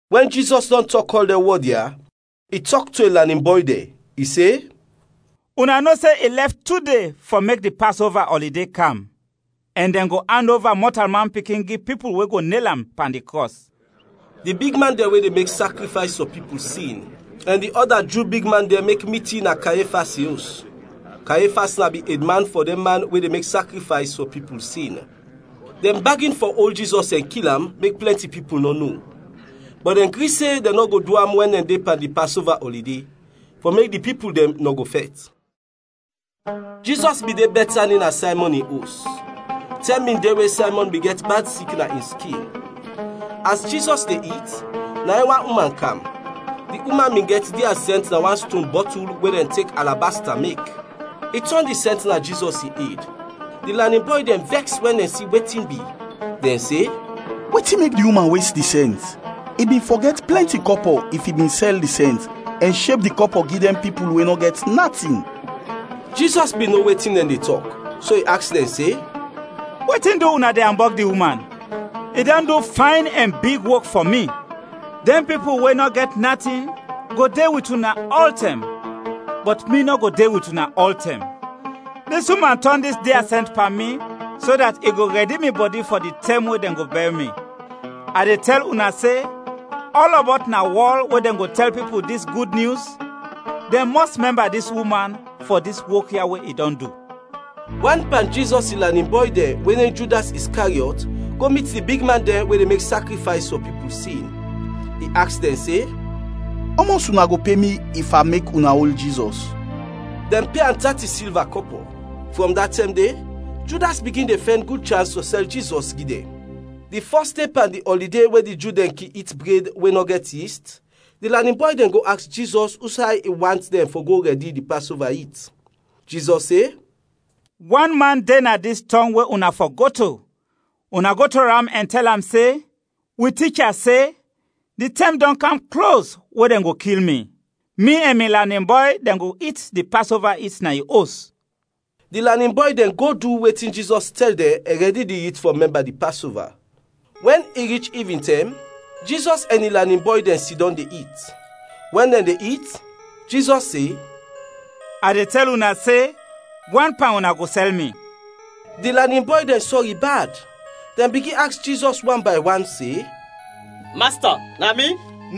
Wɛn Jizɔs dɔn tɔk ɔl dɛn wɔd ya, i tɔk to in lanin bɔy dɛn, i se, “Una no se i lɛf tu de fɔ mek di Pasova ɔlide kam, ɛn dɛn go and ova Mɔtalman Pikin gi pipul we go nel am pan di krɔs.” Di bigman dɛn we de mek sakrifays fɔ pipul sin ɛn di ɔda Ju bigman dɛn mek mitin na Kayefas in os; Kayefas na bin edman fɔ dɛn man we de mek sakrifays fɔ pipul sin. Dɛn bagin fɔ ol Jizɔs ɛn kil am, mek plɛnti pipul nɔ no. Bɔt dɛn gri se dɛn nɔ go du am wɛn dɛn de pan di Pasova ɔlide, fɔ mek di pipul dɛn nɔ go fɛt. Jizɔs bin de Bɛtani na Saymɔn in os; tɛm bin de we Saymɔn bin gɛt bad sik na in skin. As Jizɔs de it, na in wan uman kam. Di uman bin gɛt dia sɛnt na wan ston bɔtul we dɛn tek alabasta mek; i tɔn di sɛnt na Jizɔs in ed. Di lanin bɔy dɛn vɛks wɛn dɛn si wetin bi, dɛn se, “Wetin mek di uman wes di sɛnt? I bin fɔ gɛt plɛnti kɔpɔ if i bin sɛl di sɛnt, ɛn sheb di kɔpɔ gi dɛn pipul we nɔ gɛt natin.” Jizɔs bin no wetin dɛn de tɔk, so i aks dɛn se, “Wetin du una de ambɔg di uman? I dɔn du fayn ɛn big wok fɔ mi. Dɛn pipul we nɔ gɛt natin go de wit una ɔltɛm, bɔt mi nɔ go de wit una ɔltɛm. Dis uman tɔn dis dia sɛnt pan mi, so dat i go rɛdi mi bɔdi fɔ di tɛm we dɛn go bɛr mi. A de tɛl una se, ɔlɔbɔt na wɔl we dɛn go tɛl pipul dis gud nyus, dɛn mɔs mɛmba dis uman fɔ dis wok ya we i dɔn du.” Wan pan Jizɔs in lanin bɔy dɛn we nem Judas Iskariɔt go mit di bigman dɛn we de mek sakrifays fɔ pipul sin. I aks dɛn se, “Ɔmɔs una go pe mi if a mek una ol Jizɔs?” Dɛn pe am tati silva kɔpɔ. Frɔm da tɛm de, Judas bigin de fɛn gud chans fɔ sɛl Jizɔs gi dɛn. Di fɔs de pan di ɔlide we di Ju dɛn kin it bred we nɔ gɛt yist, di lanin bɔy dɛn go aks Jizɔs usay i want dɛn fɔ go rɛdi di Pasova it. Jizɔs se, “Wan man de na dis tɔng we una fɔ go to, una go to am ɛn tɛl am se, ‘Wi Ticha se, di tɛm dɔn kam klos we dɛn go kil mi. Mi ɛn mi lanin bɔy dɛn go it di Pasova it na yu os.’” Di lanin bɔy dɛn go du wetin Jizɔs tɛl dɛn ɛn rɛdi di it fɔ mɛmba di Pasova. Wɛn i rich ivintɛm, Jizɔs ɛn in lanin bɔy dɛn sidɔm de it. Wɛn dɛn de it, Jizɔs se, “A de tɛl una se, wan pan una go sɛl mi.” Di lanin bɔy dɛn sɔri bad, dɛn bigin aks Jizɔs wan bay wan se, “Masta, na mi?”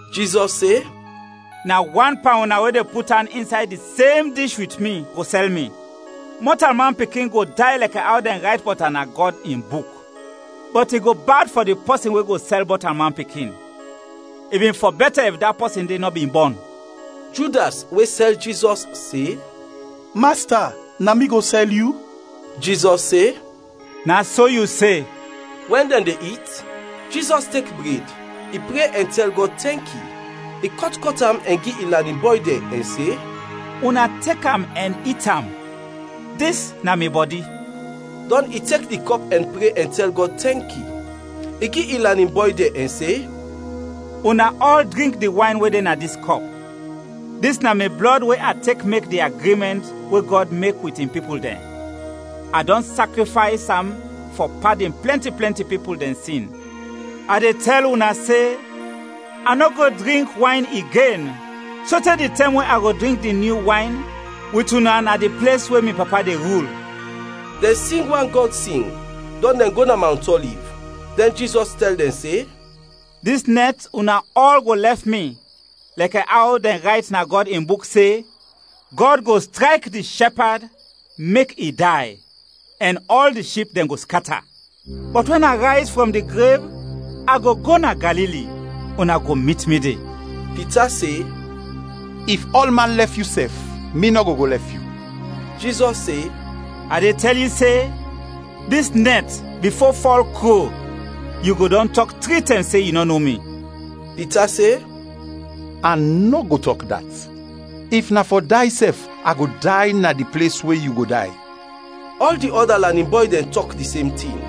Jizɔs se, “Na wan pan una we de put an insay di sem dish wit mi go sɛl mi. Mɔtalman Pikin go day lɛkɛ aw dɛn rayt bɔt am na Gɔd in Buk, bɔt i go bad fɔ di pɔsin we go sɛl Mɔtalman Pikin! I bin fɔ bɛtɛ if da pɔsin de nɔ bin bɔn!” Judas we sɛl Jizɔs se, “Masta, na mi go sɛl yu?” Jizɔs se, “Na so yu se.” We dɛn de it, Jizɔs tek bred, i pre ɛn tɛl Gɔd tɛnki. I kɔt kɔt am ɛn gi in lanin bɔy dɛn ɛn se, “Una tek am ɛn it am, dis na mi bɔdi.” Dɔn i tek di kɔp ɛn pre ɛn tɛl Gɔd tɛnki. I gi in lanin bɔy dɛn ɛn se, “Una ɔl drink di wayn we de na dis kɔp; dis na mi blɔd we a tek mek di agrimɛnt we Gɔd mek wit in pipul dɛn, a dɔn sakrifays am fɔ padin plɛnti plɛnti pipul dɛn sin. A de tɛl una se, a nɔ go drink wayn igen sote di tɛm we a go drink di nyu wayn wit una na di ples we mi Papa de rul.” Dɛn sing wan Gɔd sing, dɔn dɛn go na Mawnt Ɔliv. Dɛn Jizɔs tɛl dɛn se, “Dis nɛt una ɔl go lɛf mi, lɛkɛ aw dɛn rayt na Gɔd in Buk se, ‘Gɔd go strayk di shɛpad, mek i day, ɛn ɔl di ship dɛn go skata!’ Bɔt wɛn a rayz frɔm di grev, a go go na Galili, una go mit mi de.” Pita se, “If ɔlman lɛf yu sɛf, mi nɔ go go lɛf yu.” Jizɔs se, “A de tɛl yu se, dis nɛt bifo fɔl kro, yu go dɔn tɔk tri tɛm se yu nɔ no mi.” Pita se, “A nɔ go tɔk dat, if na fɔ day sɛf a go day na di ples we yu go day.” Ɔl di ɔda lanin bɔy dɛn tɔk di sem tin.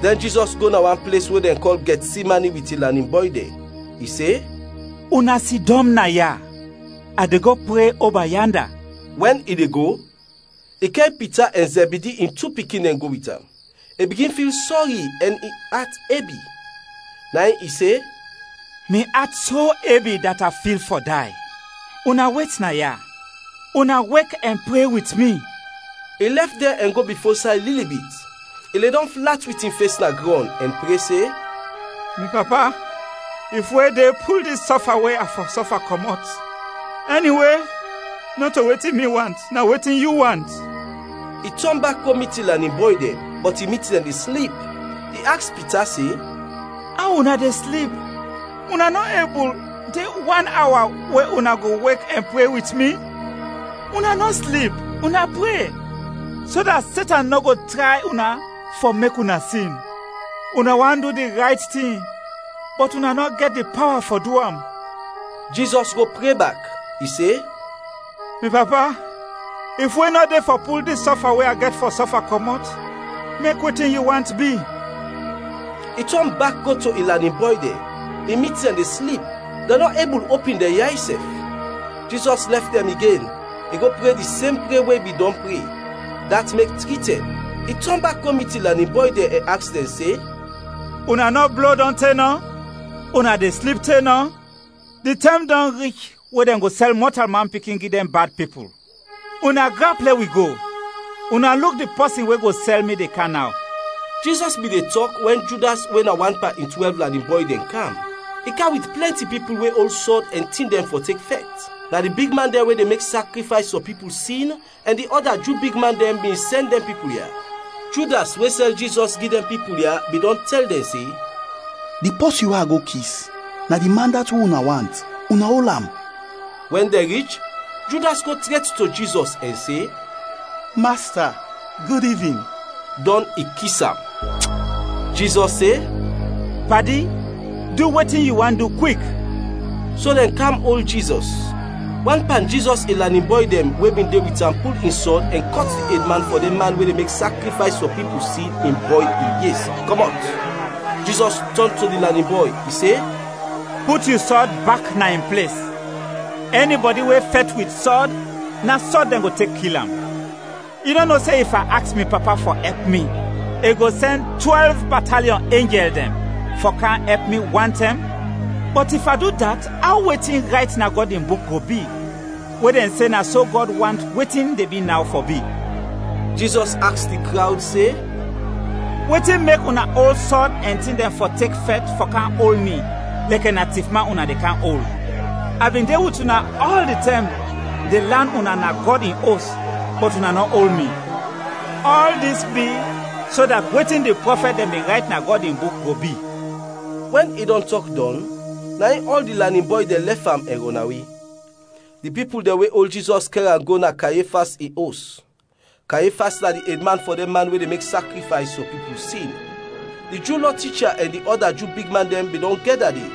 Dɛn Jizɔs go na wan ples we dɛn kɔl Gɛtsemani wit in lanin bɔy dɛn. I se, “Una sidɔm naya, a de go pre oba yanda.” Wɛn i de go, i kɛr Pita ɛn Zɛbidi in tu pikin dɛn go wit am. I bigin fil sɔri ɛn in at ebi. Na in i se, “Mi at so ebi dat a fil fɔ day. Una wet naya, una wek ɛn pre wit mi.” I lɛf dɛn ɛn go bifo say lili bit, i ledɔm flat wit in fes na grɔn, ɛn pre se, “Mi Papa, if we de, pul dis sɔfa we a fɔ sɔfa kɔmɔt, ɛniwe, nɔto wetin mi want, na wetin yu want.” I tɔn bak go mit in lanin bɔy dɛn, bɔt i mit dɛn de slip; i aks Pita se, “Aw una de slip, una nɔ ebul de wan awa we una go wek ɛn pre wit mi? Una nɔ slip, una pre, so dat Setan nɔ go tray una fɔ mek una sin. Una want du di rayt tin bɔt una nɔ gɛt di pawa fɔ du am.” Jizɔs go pre bak, i se, “Mi Papa, if we nɔ de fɔ pul dis sɔfa we a gɛt fɔ sɔfa kɔmɔt, mek wetin yu want bi.” I tɔn bak go to in lanin bɔy dɛn, i mit dɛn de slip, dɛn nɔ ebul opin dɛn yay sɛf. Jizɔs lɛf dɛn igen, i go pre di sem pre we i bin dɔn pre; dat mek tri tɛm. I tɔn bak go mit in lanin bɔy dɛn ɛn aks dɛn se, “Una nɔ blo dɔn te nɔ? Una de slip te nɔ? Di tɛm dɔn rich we dɛn go sɛl Mɔtalman Pikin gi dɛn bad pipul. Una grap, lɛ wi go. Una luk di pɔsin we go sɛl mi, de kam naw!” Jizɔs bin de tɔk wɛn Judas we na wan pan in twɛlv lanin bɔy dɛn, kam. I kam wit plɛnti pipul we ol sɔd ɛn tin dɛn fɔ tek fɛt. Na di bigman dɛn we de mek sakrifays fɔ pipul sin ɛn di ɔda Ju bigman dɛn bin sɛn dɛn pipul ya. Judas we sɛl Jizɔs gi dɛn pipul ya, bin dɔn tɛl dɛn se, “Di pɔsin we a go kis, na di man dat we una want, una ol am.” Wɛn dɛn rich, Judas go tret to Jizɔs ɛn se, “Masta, gud ivin,” dɔn i kis am. Jizɔs se, “Padi, du wetin yu want du kwik!” So dɛn kam ol Jizɔs. Wan pan Jizɔs in lanin bɔy dɛn we bin de wit am pul in sɔd ɛn kɔt di edman fɔ dɛn man we de mek sakrifays fɔ pipul sin in bɔy in yes, kɔmɔt. Jizɔs tɔn to di lanin bɔy, i se, “Put yu sɔd bak na in ples, ɛnibɔdi we fɛt wit sɔd, na sɔd dɛn go tek kil am. Yu nɔ no se if a aks mi Papa fɔ ɛp mi, i go sɛn twɛlv bataliɔn enjɛl dɛn fɔ kam ɛp mi wantɛm? Bɔt if a du dat, aw wetin rayt na Gɔd in Buk go bi, we dɛn se na so Gɔd want wetin de bi naw fɔ bi?” Jizɔs aks di krawd se, “Wetin mek una ol sɔd ɛn tin dɛn fɔ tek fɛt fɔ kam ol mi lɛkɛ na tifman una de kam ol? A bin de wit una ɔl di tɛm de lan una na Gɔd in Os, bɔt una nɔ ol mi. Ɔl dis bi so dat wetin di Prɔfɛt dɛn bin rayt na Gɔd in Buk go bi.” Wɛn i dɔn tɔk dɔn, na in ɔl di lanin bɔy dɛn lɛf am ɛn rɔnawe. Di pipul dɛn we ol Jizɔs kɛr am go na Kayefas in os. Kayefas na di edman fɔ dɛn man we de mek sakrifays fɔ pipul sin. Di Ju Lɔ ticha ɛn di ɔda Ju bigman dɛn bin dɔn gɛda de.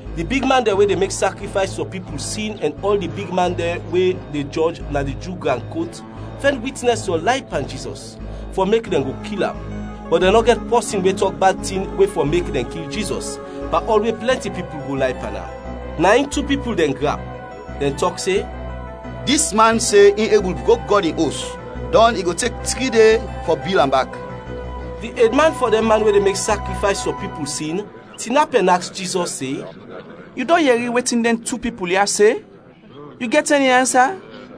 Di bigman dɛn we de mek sakrifays fɔ pipul sin ɛn ɔl di bigman dɛn we de jɔj na di Ju gran kot fɛn witnɛs fɔ lay pan Jizɔs, fɔ mek dɛn go kil am; bɔt dɛn nɔ gɛt pɔsin we tɔk bad tin we fɔ mek dɛn kil Jizɔs pan ɔl we plɛnti pipul go lay pan am. Na in tu pipul dɛn grap, dɛn tɔk se, “Dis man se in ebul brok Gɔd in Os, dɔn i go tek tri de fɔ bil am bak.” Di edman fɔ dɛn man we de mek sakrifays fɔ pipul sin, tinap ɛn aks Jizɔs se, “Yu dɔn yɛri wetin dɛn tu pipul ya se, yu gɛt ɛni ansa?”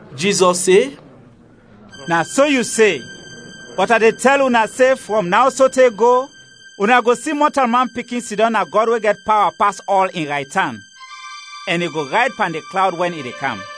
Jizɔs se, “Na so yu se. Bɔt a de tɛl una se frɔm naw sote go, una go si Mɔtalman Pikin sidɔm na Gɔd we gɛt pawa pas ɔl, in raytan, ɛn i go rayd pan di klawd wɛn i de kam!”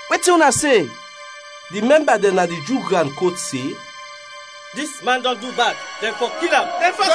Wetin una se?” Di mɛmba dɛn na di Ju gran kot se, “Dis man dɔn du bad, dɛn fɔ kil am.”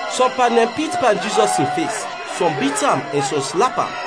Sɔm pan dɛn pit pan Jizɔs in fes, sɔm bit am ɛn sɔm slap am.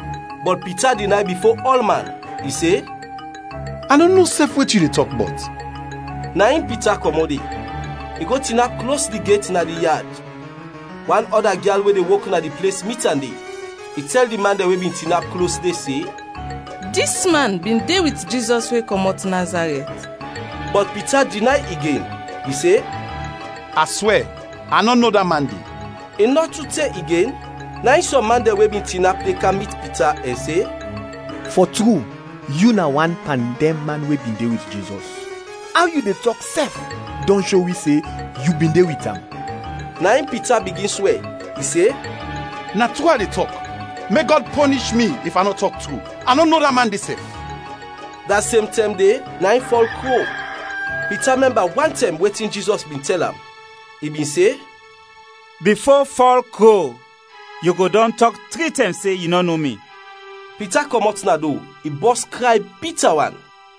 Bɔt Pita dinay bifo ɔlman. I se, “A nɔ no sɛf wetin yu de tɔk bɔt.” Na in Pita kɔmɔt de, i go tinap klos di get na di yad. Wan ɔda gyal we de wok na di ples mit am de, i tɛl di man dɛn we bin tinap klos de se, “Dis man bin de wit Jizɔs we kɔmɔt Nazarɛt.” Bɔt Pita dinay igen. I se, “A swɛ, a nɔ no da man de!” I nɔ tu te igen, na in sɔm man dɛn we bin tinap de kam mit Pita ɛn se, “Fɔ tru, yu na wan pan dɛn man we bin de wit Jizɔs, aw yu de tɔk sɛf dɔn sho wi se yu bin de wit am.” Na in Pita bigin swɛ. I se, “Na tru a de tɔk! Mek Gɔd pɔnish mi if a nɔ tɔk tru! A nɔ no da man de sɛf!” Da sem tɛm de, na in fɔl kro. Pita mɛmba wantɛm wetin Jizɔs bin tɛl am: I bin se, “Bifo fɔl kro, yu go dɔn tɔk tri tɛm se yu nɔ no mi.” Pita kɔmɔt na do, i bɔs kray bita wan.